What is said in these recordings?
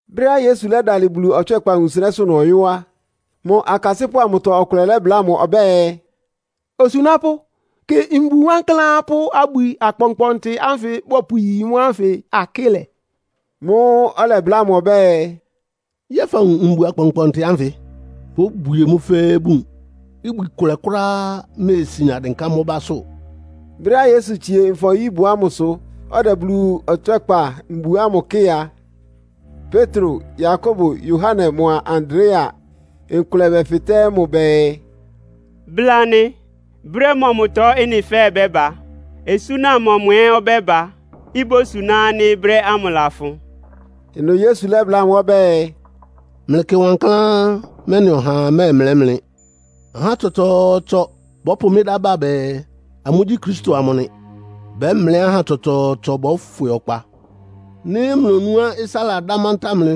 Brɛ́á Yesu lɛ́dalɩ Bulu ɔtswɛ́kpa wunsɩnɛ́sʋ́ ɩnʋ ɔyɔ́ á, mʋ akasɩ́pʋ́ amʋtɔ ɔkʋlɛ lɛ́bláa mʋ ɔbɛ́ɛ, “Osunápʋ́, kɩ mbu wankláán pʋ́ abwi akpɔnkpɔntɩ ánfɩ bɔpʋyi mʋ́ ánfɩ akɩ́lɛ!” Mʋ́ʋ́ ɔlɛbláa mʋ ɔbɛ́ɛ, “Yɛ́ɛ fawun mbu akpɔnkpɔɔnkpɔntɩ ánfɩ? Bóbwie mʋ́ fɛ́ɛ́ bun. Ibwi kʋlɛ kʋ́ráá méesian dɩnká mʋ́ básʋ́.” Brɛ́á Yesu tsie Nfɔ-nyíbʋ ámʋsʋ, ɔdɛ Bulu ɔtswɛ́kpa mbu ámʋ kɩ́ɩ a, Petro, Yakobo, Yohane mʋa Andrea nkʋlɛ bɛfɩtɛ́ mʋ bɛɛ, “Bla anɩ, brɛ́ mɔmʋtɔ ɩ́nɩ fɛ́ɛ́ bɛ́ba? Osúna mɔmʋ ɛ́ ɔbɛ́ba, ibósuná ánɩ́ mʋ́ brɛ́ lafʋn?” Ɩnʋ Yesu lɛ́bláa amʋ́ ɔbɛ́ɛ, “Mlɩkɩ wankláán, mɛ́nɩ ɔhaa mɛ́ɛmlɛ́ mlɩ. Ahá tsɔtsɔɔtsɔ bɔ́pʋ mɩ́ dá ba bɛɛ, amʋ́gyí Kristo amʋ nɩ. Bɛ́mlɛ́ ahá tsɔtsɔɔtsɔ bɔ́fwɩ ɔkpa. Nɩ́ mlonúá ɩsá ladá mantáa mlɩ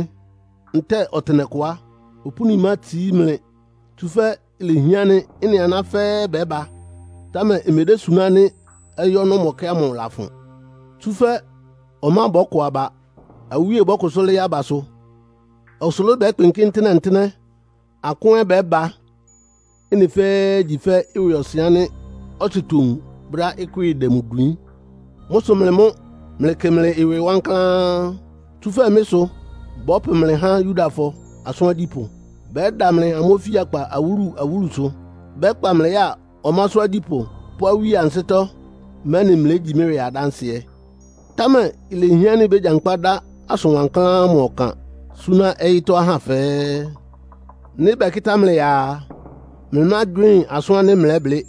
ntɛ́ɛ ɔtɩnɛkʋ á, opúni mátsií mlɩ Tsúfɛ́ lehián ánɩ́ ɩ́nɩ aná fɛ́ɛ́ bɛ́ba, támɛ imedésuná ánɩ́ ɔyɩ́ ɔnɔ́mɔkɛ́ ámʋ lafʋn. Tsúfɛ́ ɔmá bɔ́kɔ aba. Awíe bɔ́kʋsʋ́ lɩ́ɩ́ abasʋ. Ɔsʋlʋ́ʋ bɛ́kpɩnkɩ́ ntɩ́nɛ́-ntɩ́nɛ́. Akʋ́n ɛ́ bɛ́ba. Ɩ́nɩ fɛ́ɛ́ igyi fɛ́ ɩwɩɔsɩn ánɩ́ ɔtsɩ towun brɛ́á ɩkwɩ́ɩ dɛ mʋ dwiín. “Mʋ́ sʋ mlɩ mʋ́ mlɩkɩ mlɩ ɩwɩ wankláán. Tsúfɛ́ mɩ́ sʋ bɔ́pʋ mlɩ há Yudafɔ asʋ́n agyípʋ́, bɛ́da mlɩ amʋ́ ofíakpa awúlu-awúlusʋ. Bɛ́kpa mlɩ ya ɔmásʋ́ agyípʋ́ pʋ́ awíe ansɩ́tɔ́, mɛ́nɩ mlégyi mɩ́ ɩwɩ adánsɩɛ. Támɛ ilehián ánɩ́ bégyankpá dá asʋn wankláán ámʋ ɔkan súná ɔyɩ́tɔ́ ahá fɛ́ɛ́. Nɩ́ bɛkɩ́tá mlɩ ya a, mlɩmágywɩ́ɩn asʋ́n ánɩ́ mlɛ́blɩ́.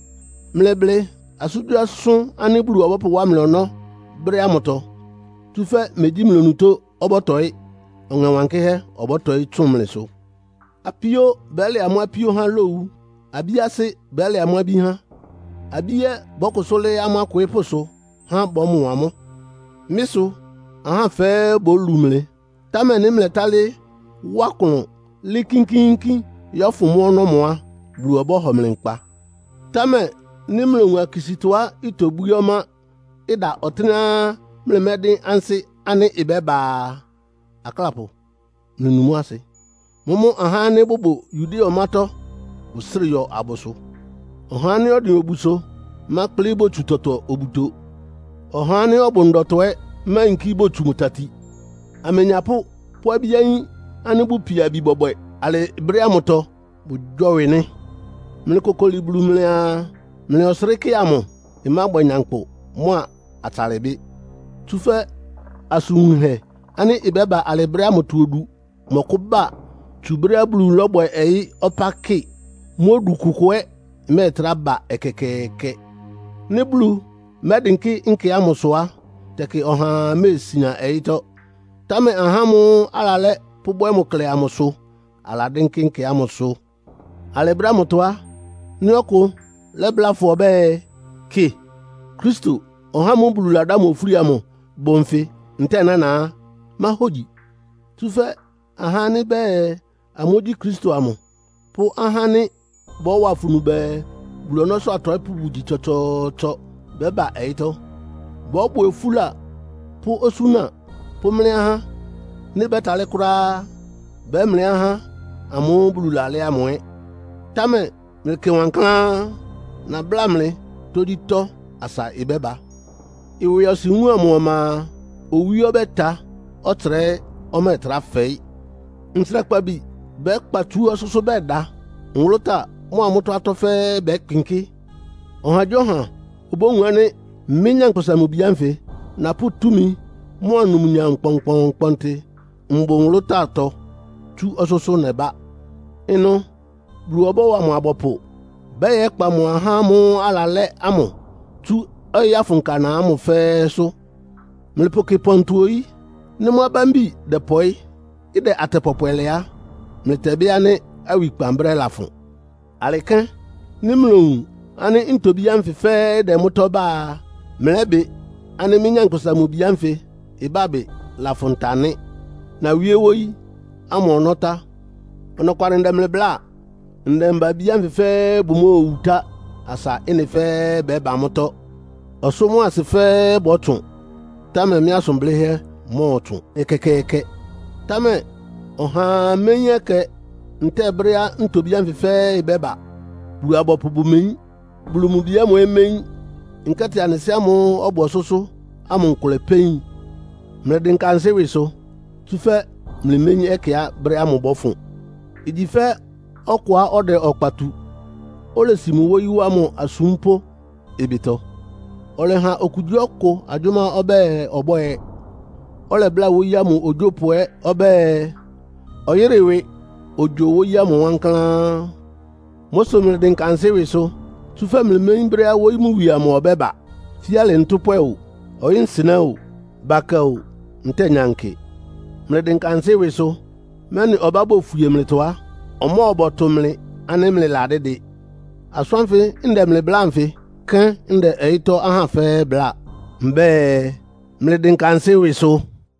Mlɩblɩ asʋ́ngyíasʋ́n ánɩ́ Bulu ɔbɔ́pʋwá mlɩ ɔnɔ́ alɩ brɛ́ ámʋtɔ. Tsúfɛ́ megyí mlɩ onutó ɔbɔ́tɔɩ́, Ɔŋɛ Wankɩ́hɛ́ ɔbɔ́tɔɩ́ tsʋn mlɩsʋ. “Apíó bɛ́lɛ amʋ́ apíó há lowu. Abí asɩ́ bɛ́lɛ amʋ́ abí há. Abí ɛ́ bɔ́kʋsʋ́ lɩ́ɩ́ amʋ́ akwɩɩ́pʋ́sʋ, há bɔ́mɔ amʋ́. Mɩ́ sʋ ahá fɛ́ɛ́ bólu mlɩ, támɛ nɩ́ mlɛ́talɩ́ wá klʋn lɩ́ɩ́ kínkíínkín yɔ́fʋn mʋ́ ɔnɔ́mɔ á, Bulu ɔbɔ́hɔ mlɩ nkpa. “Támɛ nɩ́ mlowun akisítɔá itobwíé ɔmá, ɩda ɔtɩ́nɛ́á mlɩmɛ́dɩ́n ansɩ́ ánɩ́ ɩbɛ́ba a, (aklápʋ, mlɩnu mʋ́ asɩ.) Mʋ́mʋ́ ahá ánɩ́ bʋbʋ Yudea ɔmátɔ́ bʋsrɩ yɔ abʋsʋ. Ɔhá ánɩ́ ɔdɩn obusʋ mákplɩ botsu tɔtɔ obuto! Ɔhá ánɩ́ ɔbʋ ndɔtɔ ɛ́ máyinkí botsu mʋ tati. Amenyapʋ́ pʋ́ abí-ayín ánɩ́ bʋpia abi bɔbwɛ alɩ brɛ́ ámʋtɔ, bʋgyɔ́wɩ nɩ́! Mlɩkokoli Bulu mlɩaa, mlɩ ɔsrɩ́kɛ́ amʋ ɩmábwɛ nyankpʋ mʋ́a atsalɩbɩ́. Tsúfɛ́ asʋn wunhɛ ánɩ́ ɩbɛ́ba alɩ brɛ́ ámʋtɔ odu mɔkʋ́ba tsú brɛ́á Bulu lɔ́bwɛ ɔyɩ́ ɔpá kɩ. Mʋ́ odu kʋkʋ ɛ́ ɩmɛ́ɛtrá ba ɛkɛkɛɛkɛ. Nɩ́ Bulu mɛ́dɩnkɩ́ nkɛ ámʋsʋ á, tɛkɩ ɔhaa méesian ɔyɩ́tɔ́. Támɛ ahá ámʋ́ʋ́ alalɛ́ pʋ́bwɛ́ mʋ klɛ amʋ sʋ aladɩ́nkɩ́ nkɛ ámʋsʋ. “Alɩ brɛ́ ámʋtɔ á, nɩ́ ɔkʋ lɛ́bláa fʋ ɔbɛ́ɛ, ‘Kɩ, Kristo, (ɔhá ámʋ́ʋ́ Bulu ladá mʋ ofúli amʋ) bʋ nfɩ ntɛ́ɛ nána’ á, máhógyi. Tsúfɛ́ ahá ánɩ́ bɛɛ amʋ́gyí Kristo amʋ pʋ́ ahá ánɩ́ bɔ́wa afunu bɛɛ, Bulu ɔnɔ́sʋ́ atɔɩ́pʋ́ bʋgyi tsɔtsɔɔtsɔ bɛ́ba ɔyɩ́tɔ́. Bɔ́bwɛ ofúla pʋ́ osúna pʋ́mlɛ́ ahá. Nɩ́ bɛ́talɩ́ kʋ́ráá á, bɛ́mlɛ́ ahá ámʋ́ʋ́ Bulu lalɛ́ ámʋ ɛ́. Támɛ mlɩkɩ wankláán! Nabláa mlɩ tógyítɔ́ asa ɩbɛ́ba. “Ɩwɩɔsɩn wúun amʋ ɔma a, owí ɔbɛ́ta, ɔtsra ɛ́ ɔmɛ́ɛtrá fɛɩ́. Ntsrakpabi bɛ́kpa tsú ɔsʋ́sʋ́ bɛda. Nwʋlʋ́táa mʋ́a mʋ́tɔ́ atɔ́ fɛ́ɛ́ bɛ́kpɩnkɩ́. Ɔhagyíɔha obówun ánɩ́ mɩ́, Nyankpʋsa-Mʋ-Bi ánfɩ napʋ́ túmi mʋ́a numnyam kpɔnkpɔntɩ mbʋ nwʋlʋ́táatɔ tsú ɔsʋ́sʋ́ nɛbá. Ɩnʋ Bulu ɔbɔ́wa mʋ abɔpʋ bɛ́yɛkpa mʋ ahá ámʋ́ʋ́ alalɛ́ ámʋ tsú ɔyɩ́ afʋnka ana ámʋ fɛ́ɛ́sʋ́. “Mlɩpʋkɩ pɔntɔ oyí. Nɩ́ mʋ́ abámbi dɛpɔɩ́, ɩdɛ atɛ pɔpwɛ lɛ á, mlɩtɛbɩ́ ánɩ́ awikpan brɛ́ lafʋn. Alɩ kɛ́n, nɩ́ mlowun ánɩ́ ntobí ánfɩ fɛ́ɛ́ ɩdɛ mʋ́tɔ́ bá a, mlɛ́bɩ ánɩ́ mɩ́, Nyankpʋsa-Mʋ-Bi ánfɩ ɩbábɩ lafʋn ta nɩ́. Nawíé wóyí ámʋ ɔnɔ́ tá. Ɔnɔkwalɩ ndɛ mlɩ bláa. Ndɛmba-abí anfɩ fɛ́ɛ́ bʋmóowu tá, asa ɩ́nɩ fɛ́ɛ́ bɛ́ba mʋ́tɔ́. Ɔsʋ́ mʋ́a asɩ fɛ́ɛ́ bɔ́tsʋn, támɛ mɩ́ asʋn blɩ́hɛ́ mɔ́ɔtsʋn ɛkɛkɛɛkɛ. “Támɛ ɔhaa méyín ɛkɛ ntɛ́ɛ brɛ́á ntobí ánfɩ fɛ́ɛ́ ɩbɛ́ba. Bulu-abɔpʋ bʋmeyín. Bulu mʋ Bi ámʋ ɛ́ méyín, nkɛ́tɩ anɩ Sɩ́ ámʋ́ʋ́ ɔbʋ ɔsʋ́sʋ́ ámʋ nkʋlɛ pɛ́ yin. Mlɩdɩnka ansɩ́ ɩwɩsʋ, tsúfɛ́ mlɩméyín ɛkɛá brɛ́ ámʋ ɩbɔ́fʋn. Igyi fɛ́ ɔkʋá ɔdɛ ɔkpa tu, olesi mʋ wóyí wá mʋ asúmpʋ́ ɩbɩtɔ. Ɔlɛha okugyíɔkʋ agyʋ́má ɔbɛ́ɛ ɔbwɛ́ɛ. Ɔlɛbláa wóyí ámʋ ogyópʋ ɛ́ ɔbɛ́ɛ, ɔyɩ́rɩ ɩwɩ ogyo wóyí ámʋ wankláán. Mʋ́ sʋ mlɩdɩnka ansɩ́ ɩwɩsʋ, tsúfɛ́ mlɩméyín brɛ́á wóyí mʋ wie amʋ ɔbɛ́ba. Fíalɩ ntʋ́pwɛ o, ɔyɩ́-nsɩnɛ́ o, bakɛ o, ntɛ́ɛ nyankɩ. Mlɩdɩnka ansɩ́ ɩwɩsʋ, mɛ́nɩ ɔbá bofwie mlɩtɔ á, ɔmɔbɔtʋ mlɩ ánɩ́ mlɩladídɩ. Asʋ́n ánfɩ ndɛ mlɩ bláa anfɩ kɛ́n ndɛ ɔyɩ́tɔ́ ahá fɛ́ɛ́ bláa. Mbɛ́ɛ, ‘Mlɩdɩnka ansɩ́ ɩwɩsʋ.’”